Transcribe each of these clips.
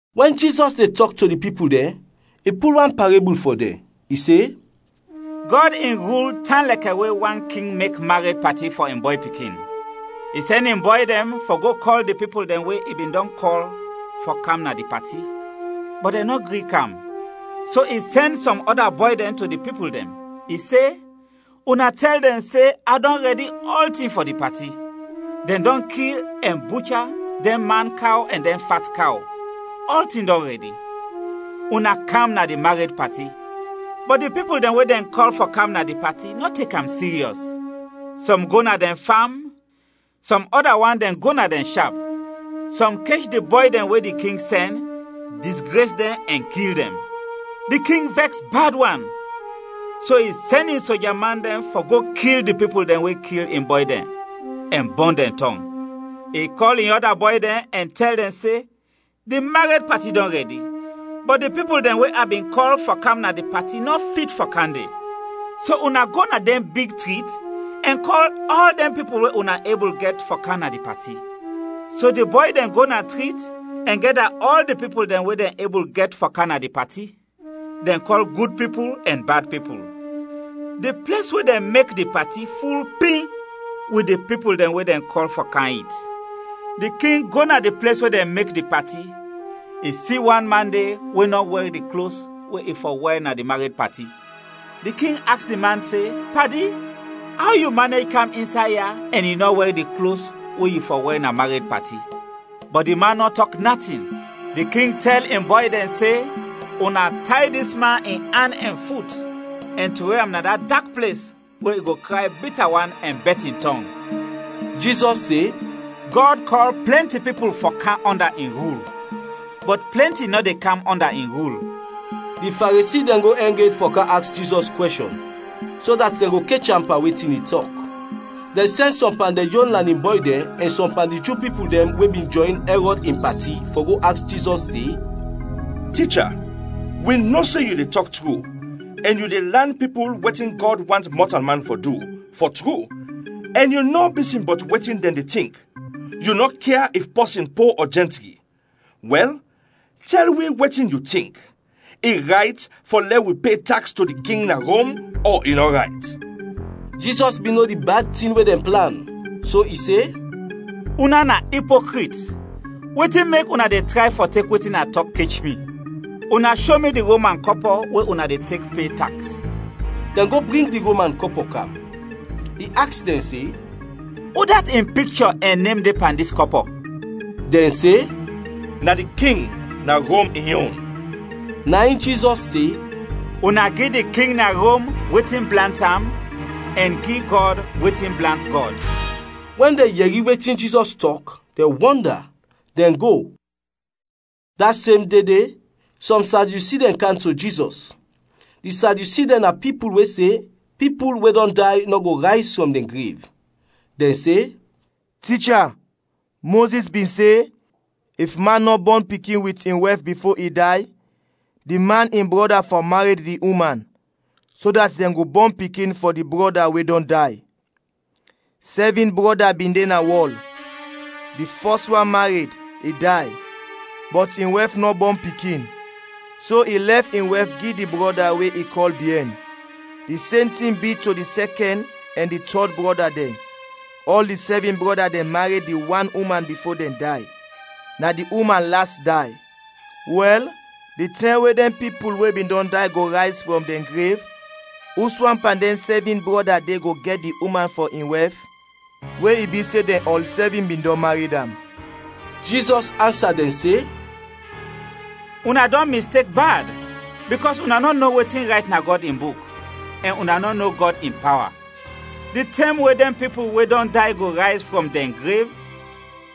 Wɛn Jizɔs de tɔk to di pipul dɛn, i pul wan parebul fɔ dɛn, i se, “Gɔd in rul tan lɛkɛ we wan king mek mared pati fɔ in bɔy pikin. I sɛn in bɔy dɛn fɔ go kɔl di pipul dɛn we i bin dɔn kɔl fɔ kam na di pati, bɔt dɛn nɔ gri kam. So i sɛn sɔm ɔda bɔy dɛn to di pipul dɛn. I se, ‘Una tɛl dɛn se, a dɔn rɛdi ɔltin fɔ di pati; dɛn dɔn kil ɛn bucha dɛn man kaw ɛn dɛn fat kaw, ɔltin dɔn rɛdi. Una kam na di mared pati!’ Bɔt di pipul dɛn we dɛn kɔl fɔ kam na di pati nɔ tek am siryɔs; sɔm go na dɛn fam, sɔm ɔda wan dɛn go na dɛn shap. Sɔm kech di bɔy dɛn we di king sɛn, disgres dɛn ɛn kil dɛn. Di king vɛks bad wan, so i sɛn in soja man dɛn fɔ go kil di pipul dɛn we kil in bɔy dɛn ɛn bɔn dɛn tɔng. I kɔl in ɔda bɔy dɛn ɛn tɛl dɛn se, ‘Di mared pati dɔn rɛdi, bɔt di pipul dɛn we a bin kɔl fɔ kam na di pati nɔ fit fɔ kam de. So una go na dɛn big trit ɛn kɔl ɔl dɛn pipul we una ebul gɛt fɔ kam na di pati.’ So di bɔy dɛn go na trit ɛn gɛda ɔl di pipul dɛn we dɛn ebul gɛt fɔ kam na di pati. Dɛn kɔl gud pipul ɛn bad pipul. Di ples we dɛn mek di pati ful pim wit di pipul dɛn we dɛn kɔl fɔ kam it. “Di king go na di ples we dɛn mek di pati, i si wan man de we nɔ wɛr di klos we i fɔ wɛr na di mared pati. Di king aks di man se, ‘Padi, aw yu manej kam insay ya ɛn yu nɔ wɛr di klos we yu fɔ wɛr na mared pati?’ Bɔt di man nɔ tɔk natin. Di king tɛl in bɔy dɛn se, ‘Una tay dis man in an ɛn fut, ɛn trowe am na da dak ples we i go kray bita wan ɛn bɛt in tɔng!’” Jizɔs se, “Gɔd kɔl plɛnti pipul fɔ kam ɔnda in rul, bɔt plɛnti nɔ de kam ɔnda in rul.” Di Faresi dɛn go ɛng ed fɔ kam aks Jizɔs kwɛshɔn, so dat dɛn go kech am pan wetin i tɔk. Dɛn sɛn sɔm pan dɛn yon lanin bɔy dɛn, ɛn sɔm pan di Ju pipul dɛn we bin jɔyn Ɛrɔd in pati, fɔ go aks Jizɔs se, “Ticha, wi no se yu de tɔk tru ɛn yu de lan pipul wetin Gɔd want mɔtalman fɔ du, fɔ tru, ɛn yu nɔ bisin bɔt wetin dɛn de tink, yu nɔ kia if pɔsin po ɔ jɛntri. Wɛl, tɛl wi wetin yu tink, i rayt fɔ lɛ wi pe taks to di king na Rom ɔ i nɔ rayt?” Jizɔs bin no di bad tin we dɛn plan, so i se, “Una na ipokrit, wetin mek una de tray fɔ tek wetin a tɔk kech mi? Una sho mi di Roman kɔpɔ we una de tek pe taks.” Dɛn go bring di Roman kɔpɔ kam. I aks dɛn se, “Udat in pikchɔ ɛn nem de pan dis kɔpɔ?” Dɛn se, “Na di king na Rom in yon.” Na in Jizɔs se, “Una gi di king na Rom wetin blant am, ɛn gi Gɔd wetin blant Gɔd.” Wɛn dɛn yɛri wetin Jizɔs tɔk, dɛn wɔnda, dɛn go. Da sem de de, sɔm Sadyusi dɛn kam to Jizɔs. Di Sadyusi dɛn na pipul we se pipul we dɔn day nɔ go rayz frɔm dɛn grev. Dɛn se, “Ticha, Mozis bin se, ‘If man nɔ bɔn pikin wit in wɛf bifo i day, di man in brɔda fɔ mared di uman, so dat dɛn go bɔn pikin fɔ di brɔda we dɔn day.’ Sɛvin brɔda bin de na wɔl; di fɔs wan mared, i day, bɔt in wɛf nɔ bɔn pikin. So i lɛf in wɛf gi di brɔda we i kɔl biɛn. Di sem tin bi to di sɛkɛn ɛn di tɔd brɔda dɛn, ɔl di sɛvin brɔda dɛn mared di wan uman bifo dɛn day. Na di uman las day. Wɛl, di tɛm we dɛn pipul we dɔn day go rayz frɔm dɛn grev, uswan pan dɛn sɛvin brɔda de go gɛt di uman fɔ in wɛf, we i bi se dɛn ɔl sɛvin bin dɔn mared am?” Jizɔs ansa dɛn se, “Una dɔn mistek bad, bikɔs una nɔ no wetin rayt na Gɔd in Buk, ɛn una nɔ no Gɔd in pawa. Di tɛm we dɛn pipul we dɔn day go rayz frɔm dɛn grev,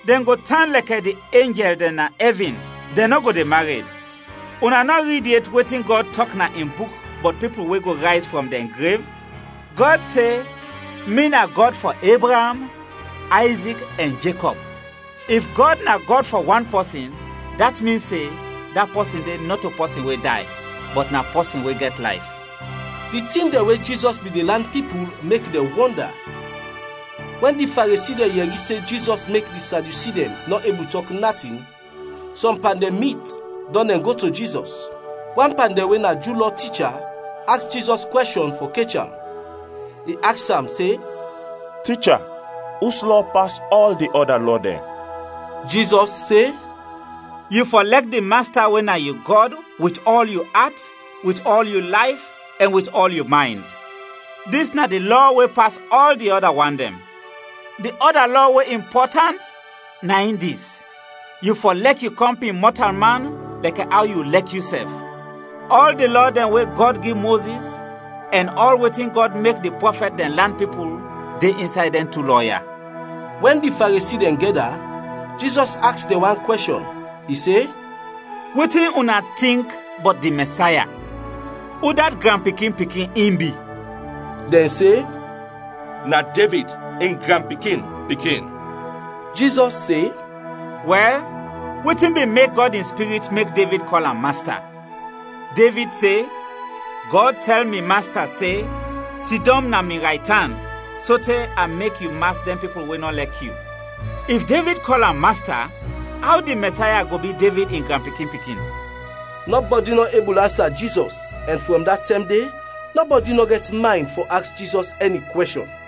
dɛn go tan lɛkɛ di enjɛl dɛn na ɛvin, dɛn nɔ go de mared. Una nɔ rid yet wetin Gɔd tɔk na in Buk bɔt pipul we go rayz frɔm dɛn grev? Gɔd se, ‘Mi na Gɔd fɔ Ebraam, Ayzik ɛn Jekɔb.’ If Gɔd na Gɔd fɔ wan pɔsin dat min se da pɔsin de nɔto pɔsin we day, bɔt na pɔsin we gɛt layf.” Di tin dɛn we Jizɔs bin de lan pipul mek dɛn wɔnda. Wɛn di Faresi dɛn yɛri se Jizɔs mek di Sadyusi dɛn nɔ ebul tɔk natin, sɔm pan dɛn mit, dɔn dɛn go to Jizɔs. Wan pan dɛn we na Ju Lɔ ticha, aks Jizɔs kwɛshɔn fɔ kech am. I aks am, se “Ticha, us lɔ pas ɔl di ɔda lɔ dɛn?” Jizɔs se, “ ‘Yu fɔ lɛk di Masta we na yu Gɔd wit ɔl yu at, wit ɔl yu layf ɛn wit ɔl yu maynd.’ Dis na di lɔ we pas ɔl di ɔda wan dɛn. Di ɔda lɔ we impɔtant na in dis: ‘Yu fɔ lɛk yu kɔmpin mɔtalman lɛkɛ aw yu lɛk yusɛf.’ Ɔl di lɔ dɛn we Gɔd gi Mozis ɛn ɔl wetin Gɔd mek di prɔfɛt dɛn lan pipul, de insay dɛn tu lɔ ya.” Wɛn di Faresi dɛn gɛda, Jizɔs aks dɛn wan kwɛshɔn, i se, “Wetin una tink bɔt di Mɛsaya? Udat granpikin-pikin in bi?” Dɛn se, “Na Devid in granpikin-pikin.” Jizɔs se, “Wɛl, wetin bin mek Gɔd in Spirit mek Devid kɔl am ‘Masta?’ Devid se, ‘Gɔd tɛl mi Masta se: Sidɔm na mi raytan sote a mek yu mas dɛn pipul we nɔ lɛk yu.’ If Devid kɔl am ‘Masta,’ aw di Mɛsaya go bi Devid in granpikin-pikin?” Nɔbɔdi nɔ ebul ansa Jizɔs ɛn frɔm da tɛm de nɔbɔdi nɔ gɛt maynd fɔ aks Jizɔs ɛni kwɛshɔn.